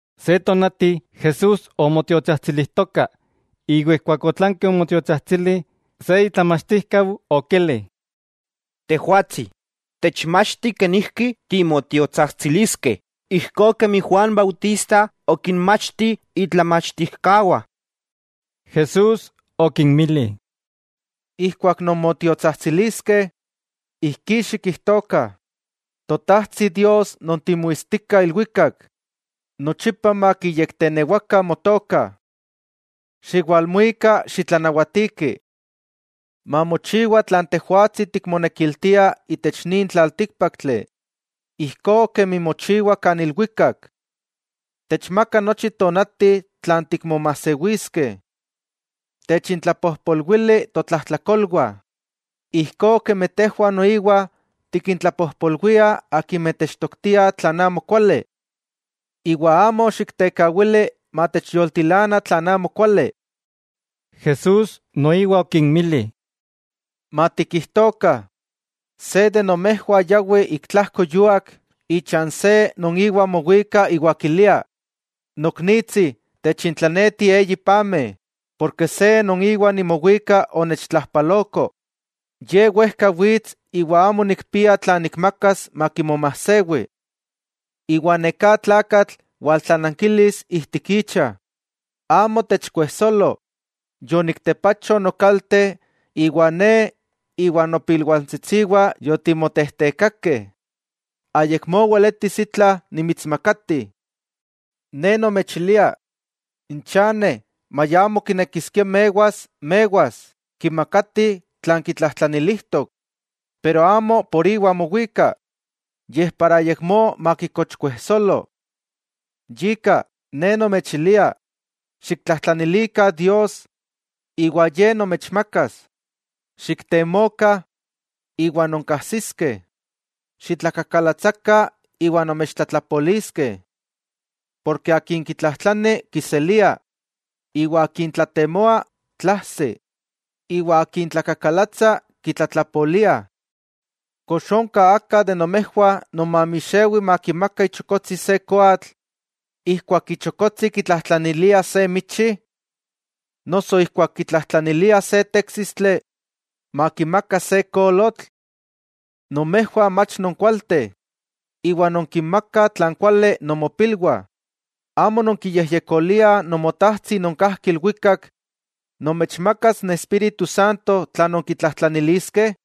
Se tonati Jesús omotiotsajtsilijtoka, iwa ijkuak otlanki omotiotsajtsili, se itlamachtijkau okili: —Tejwatsi, techmachti kenijki timotiotsajtsiliskeh, ijkó kemi Juan Bautista okinmachti itlamachtijkawah. Jesús okinmili: —Ijkuak non motiotsajtsiliskeh, ijkí xikijtokah: Totajtsi Dios non timuistika ilwikak, nochipa makiyektenewakah motoka. Xiwalmuika xitlanawatiki. Mamochiwa tlan Tejwatsi tikmonekiltia itech nin tlaltíkpaktli, ijkó kemi mochiwa kan ilwikak. Techmaka nochi tonati tlan tikmomajsewiskeh. Techintlapojpolwili totlajtlakolwah, ijkó kemi tejwah noiwa tikintlapojpolwiah akimeh techtoktiah tlan amokuali. Iwa amo xiktekawili matechyoltilana tlan amokuali. Jesús noiwa okinmili: —Matikijtokah, se de nomejwah yawi ik tlajko yúak ichan se non íwa mowika iwa kilia: “Noknitsi, techintlaneti eyi pameh, porke se non iwa nimowika onechtlajpaloko, ye wejka wits iwa amo nikpia tlan nikmakas makimomajsewi.” Iwa neká tlakatl waltlanankilis ijtik icha: “Amo techkuejsolo, yoniktepacho nokalte iwa ne iwa n nopilwantsitsiwah yotimotejtekakeh. Ayakmó weletis itla nimitsmakati.” Ne nomechilia, n chane maya amo kinekiskia mewas, mewas kimakati tlan kitlajtlanilijtok. Pero amo por iwa mowika, yej para ayakmó makikochkuejsolo. Yika, Ne nomechilia: Xiktlajtlanilikah Dios, iwa Ye nomechmakas; xiktemokah, iwa nonkajsiskeh; xitlakakalatsakah, iwa nomechtlatlapoliskeh. Porke akin kitlajtlani, kiselia; iwa akin tlatemoa, tlaajsi; iwa akin tlakakalatsa, kitlatlapoliah. '¿Kox onka aka de nomejwah non mamixewi makimaka ichokotsi se koatl, ijkuak ichokotsi kitlajtlanilia se michi? ¿Noso ijkuak kitlajtlanilia se téksistli, makimaka se kolotl? Nomejwah mach nonkualteh, iwa nonkinmakah tlan kuali nomopilwah, ¿amo nonkiyejyekoliah Nomotajtsi non kajki ilwikak nomechmakas n Espíritu Santo tla nonkitlajtlaniliskeh?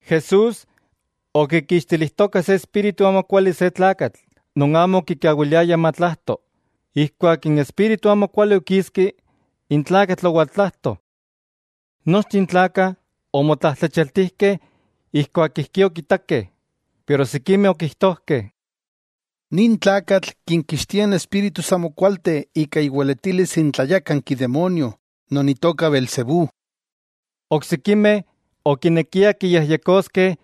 Jesús okikixtilijtoka se espíritu amokuali se tlakatl, non amo okikawiliaya matlajto, ijkuak n espíritu amokuali okiski, n tlakatl owaltlajto. Nochteh n tlakah omotlajtlachialtijkeh ijkuak ijkí okitakeh, pero sikimeh okijtojkeh: —Nin tlakatl kinkixtia n espíritus amokualteh ika iweletilis n tlayákanki demonio non itoka beelzebú. Oksikimeh okinekiah kiyejyekoskeh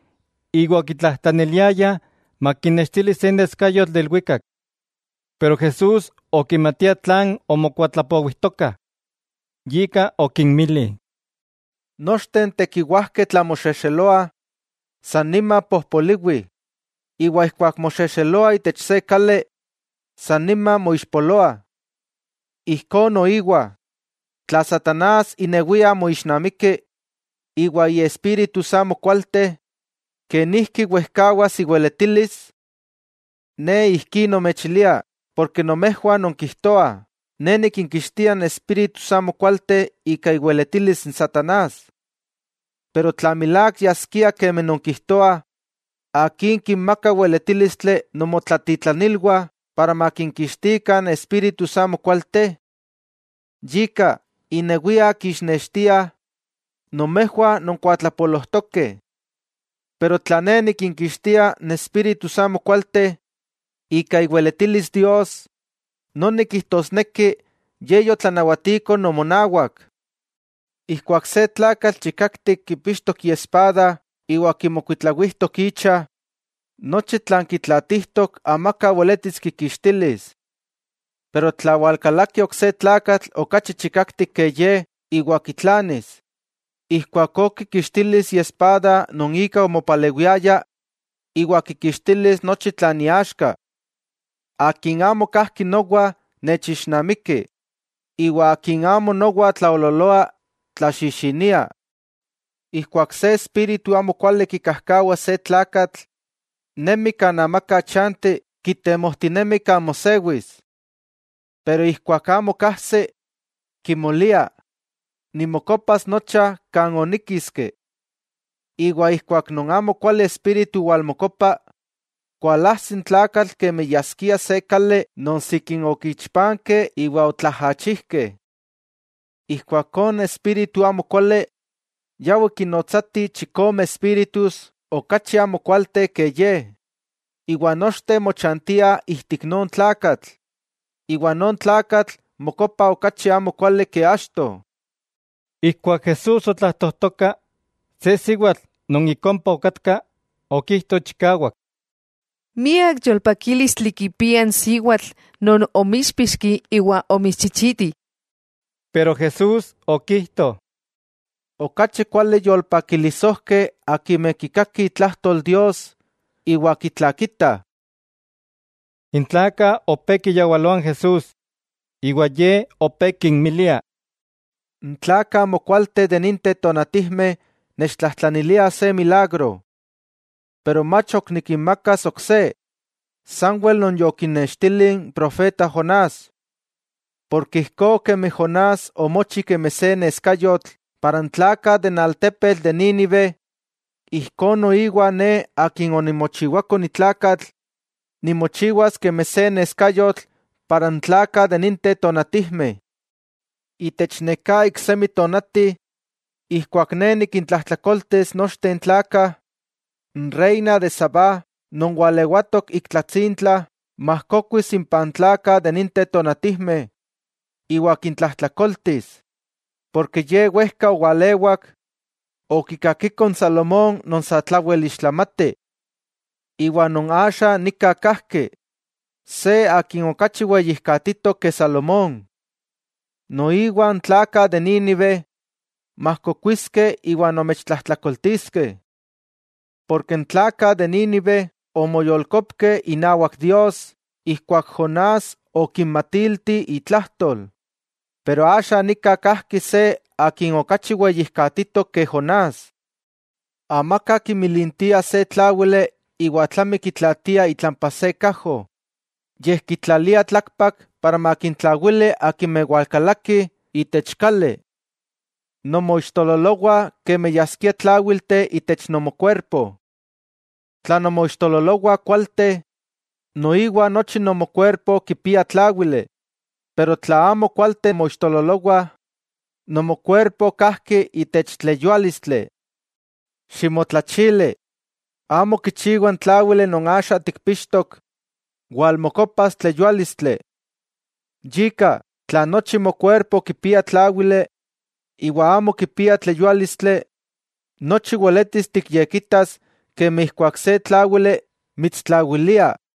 iwa okitlajtlaniliayah makinnextili se neskayotl de ilwikak. Pero Jesús okimatia tlan omokuatlapowijtokah, yika okinmili: —Nochteh n tekiwajkeh tla moxexeloah, san nima pojpoliwi; iwa ijkuak moxexeloa itech se kali, san nima moixpoloa. Ijkó noiwa, tla satanás inewia moixnamiki, iwa iespíritus amokualteh, ¿kenijki wejkawas iweletilis? Ne ijkí nomechilia ken nomejwah nonkijtoah Ne nikinkixtia n espíritus amokualteh ika iweletilis n satanás; pero tla milák yaskia kemi nonkijtoah, ¿akin kinmaka weletílistli nomotlatitlanilwah para makinkixtikah n espíritus amokualteh? Yika, innewiah kixnextiah nomejwah nonkuatlapolojtokeh. Pero tla Ne nikinkixtia n espíritus amokualteh ika iweletilis Dios, noni kijtosneki Ye yotlanawatiko nomonawak. 'Ijkuak se tlakatl chikaktik kipixtok iespada iwa kimokuitlawijtok icha, nochi tlan kitlaatijtok amaka weletis kikixtilis. Pero tla walkalaki ok se tlakatl okachi chikaktik ke ye iwa kitlanis, ijkuakó kikixtilis iespada non ika omopalewiaya iwa kikixtilis nochi tlan iaxka. 'Akin amo kajki nowa, nechixnamiki, iwa akin amo nowa tlaoololoa, tlaxixinia. 'Ijkuak se espíritu amokuali kikajkawa se tlakatl, nemi kan amaka chanti kitemojtinemi kan mosewis. Pero ijkuak amo kajsi, kimolia: “Nimokopas nocha, kan oníkiski.” Iwa ijkuak non amokuali espíritu walmokopa, kualajsi n tlakatl kemi yaskia se kali non sikin okichpankeh iwa otlaajachijkeh. Ijkuakó n espíritu amokuali yawi kinnotsatih chikome espíritus okachi amokualteh ke ye, iwa nochteh mochantiah ijtik non tlakatl, iwa non tlakatl mokopa okachi amokuali ke achto. Ijkuak Jesús otlajtojtoka, se siwatl non ik ompa okatka, okijto chikawak: —¡Miak yolpakílistli kipia n siwatl non omítspixki iwa omitschichiti! Pero Jesús okijto: —¡Okachi kuali yolpakilisojkeh akimeh kikakih itlajtol Dios iwa kitlakitah! N tlakah opé kiyawaloah n Jesús, iwa Ye opé kinmilia: —N tlakah amokualteh de ninteh tonatijmeh nechtlajtlaniliah se milagro. Pero mach ok nikinmakas ok se, sanwel non yokinnextili n profeta Jonás. Porke ijkó kemi Jonás omochi kemi se neskayotl intech n tlakah de Nínive, ijkó noiwa Ne Akin onimochiwako ni tlakatl nimochiwas kemi se neskayotl para n tlakah de ninteh tonatijmeh. Itech neká iksemi tonati ijkuak Ne nikintlajtlakoltis nochteh n tlakah, n reina de Sabá non walewatok ik tlatsintla majkokuis impah n tlakah de ninteh tonatijmeh iwa kintlajtlakoltis, porke ye wejka owalewak, okikakiko n Salomón non satlawel ixtlamati. Iwa non axa nika kajki, se Akin okachi weyijkatitok ke Salomón. Noiwa n tlakah de Nínive majkokuiskeh iwa nomechtlajtlakoltiskeh. Porke n tlakah de Nínive omoyolkopkeh inawak Dios ijkuak Jonás okinmatilti itlajtol, pero axa nika kajki se Akin okachi weyijkatitok ke Jonás. 'Amaka kimilintia se tláwili iwa tlami kitlaatia itlampa se kajo, yej kitlalia tlakpak para makintlawili akimeh walkalakih itech kali. Nomoixtololowah kemi yaskiah tláwilteh itech nomokuerpo. Tla nomoixtololowah kualteh, noiwa nochi nomokuerpo kipia tláwili, pero tla amo kualteh moixtololowah, nomokuerpo kajki itech tleyuálistli. Ximotlachili, amo kichiwa n tláwili non axa tikpixtok walmokopas tleyuálistli. Yika, tla nochi mokuerpo kipia tláwili, iwa amo kipia tleyuálistli, nochi weletis tikyekitas kemi ijkuak se tláwili mitstlawilia.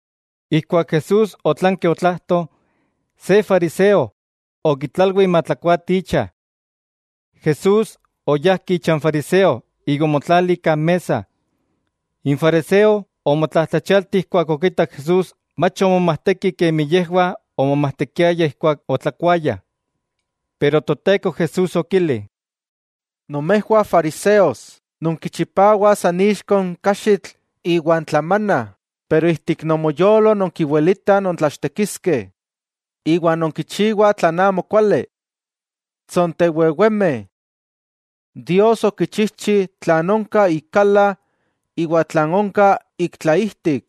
Ijkuak Jesús otlanki otlajto, se fariseo okitlalwi matlakuati icha. Jesús oyajki icha n fariseo iwa omotlali kan mesa. N fariseo omotlajtlachialti ijkuak okitak Jesús mach omomajteki kemi yejwah omomajtekiayah ijkuak otlakuayah. Pero Toteko Jesús okili: —Nomejwah fariseos, nonkichipawah san ixko n kaxitl iwan tlamana, pero ijtik nomoyolo nonkiwilitah nontlachtekiskeh iwa nonkichiwah tlan amo kuali. ¡Tsontewewemeh! Dios okichijchi tlan onka ik kala iwa tlan onka ik tlaijtik.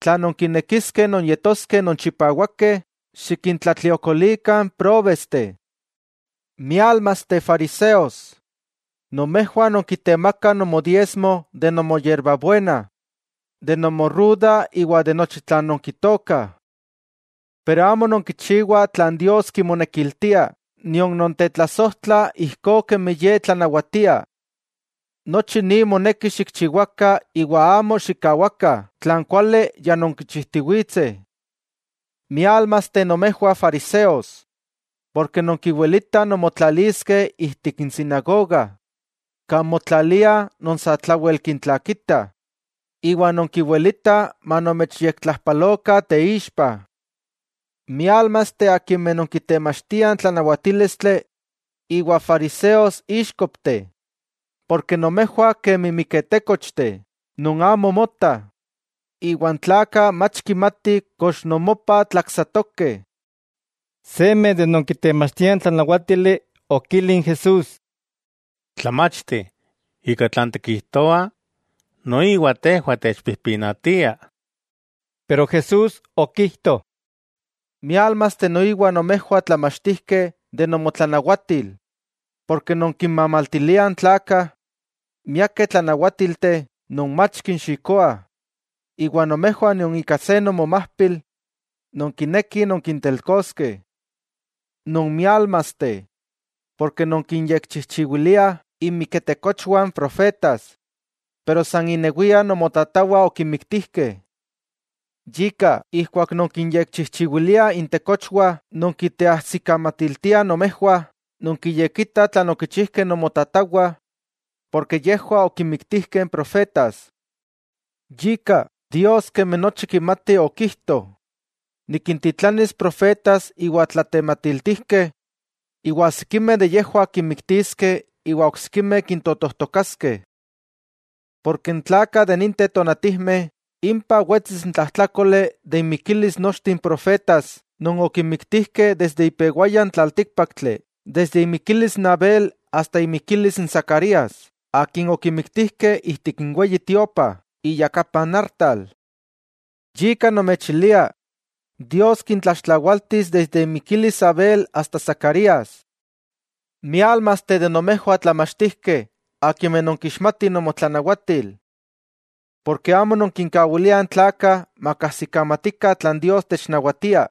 Tla nonkinekiskeh nonyetoskeh nonchipawakeh, xikintlatliokolikah n próbesteh. '¡Miálmasteh fariseos! Nomejwah nonkitemakah nomodiesmo de nomoyerbabuena, de nomoruda iwa de nochi tlan nonkitookah. Pero amo nonkichiwah tlan Dios kimonekiltia nion nontetlasojtlah ijkó kemi Ye tlanawatia. Nochi ni moneki xikchiwakah iwa amo xikkawakah tlan kuali ya nonkichijtiwitseh. '¡Miálmasteh nomejwah fariseos!, porke nonkiwilitah nonmotlaliskeh ijtik n sinagoga kan motlaliah non satlawel kintlakitah, iwa nonkiwilitah manomechyektlajpalokah teixpa. '¡Miálmasteh akimeh non kitemachtiah n tlanawatílistli iwa fariseos, íxkopteh!, nomejwah kemi miketékochteh non amo motah, iwa n tlakah mach kimatih kox nomopah tlaksatokeh. Seme de non kitemachtia n tlanawatili okili n Jesús: —Tlamachti, ika tlan tikijtoa, noiwa tejwah techpijpinatia. Pero Jesús okijto: —¡Miálmasteh noiwa nomejwah tlamachtijkeh de nomotlanawatil!, porke nonkinmamaltiliah n tlakah miakeh tlanawátilteh non mach kinxikoah, iwa nomejwah nion ika se nomomajpil nonkinekih nonkintelkoskeh. '¡Nonmiálmasteh!, porke nonkinyekchijchiwiliah inmiketekochwah n profetas, pero san innewiah nomotatawah okinmiktijkeh. Yika, ijkuak nonkinyekchijchiwiliah intekochwah nonkiteajsikamatiltiah nomejwah nonkiyekitah tlan okichijkeh nomotatawah, porke yejwah okinmiktijkeh n profetas. 'Yika, Dios kemi nochi kimati okijto: “Nikintitlanilis profetas iwa tlatematiltijkeh, iwa sikimeh de yejwah kinmiktiskeh iwa oksikimeh kintotojtokaskeh.” Porke n tlakah de ninteh tonatijmeh impah wetsis n tlajtlákoli de inmikilis nochteh n profetas non okinmiktijkeh desde ipewaya n tlaltíkpaktli, desde imikilis n Abel asta imikilis n Zacarías, akin okimiktijkeh ijtik n Weyi Tiopa, iyakapa n artal. Yika nomechilia Dios kintlaxtlawaltis desde imikilis Abel asta Zacarías. '¡Miálmasteh de nomejwah tlamachtijkeh akimeh nonkixmatih nomotlanawatil! Porke amo nonkinkawiliah n tlakah makajsikamatikah tlan Dios technawatia,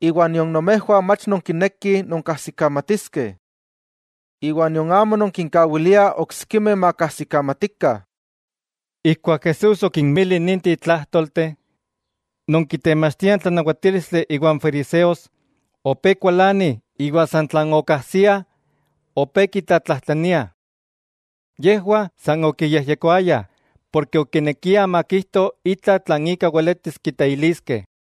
nion nomejwah mach nonkinekih nonkajsikamatiskeh. Nion amo nonkinkawiliah oksikimeh makajsikamatikah. Ijkuak Jesús okinmili ninteh tlájtolteh, non kitemachtiah n tlanawatílistli iwa n fariseos opé kualanih iwa san tlan okajsiah opé kitlatlajtlaniah. Yejwah san okiyejyekoayah porke okinekiah makijto itla tlan ika weletis kiteiliskeh.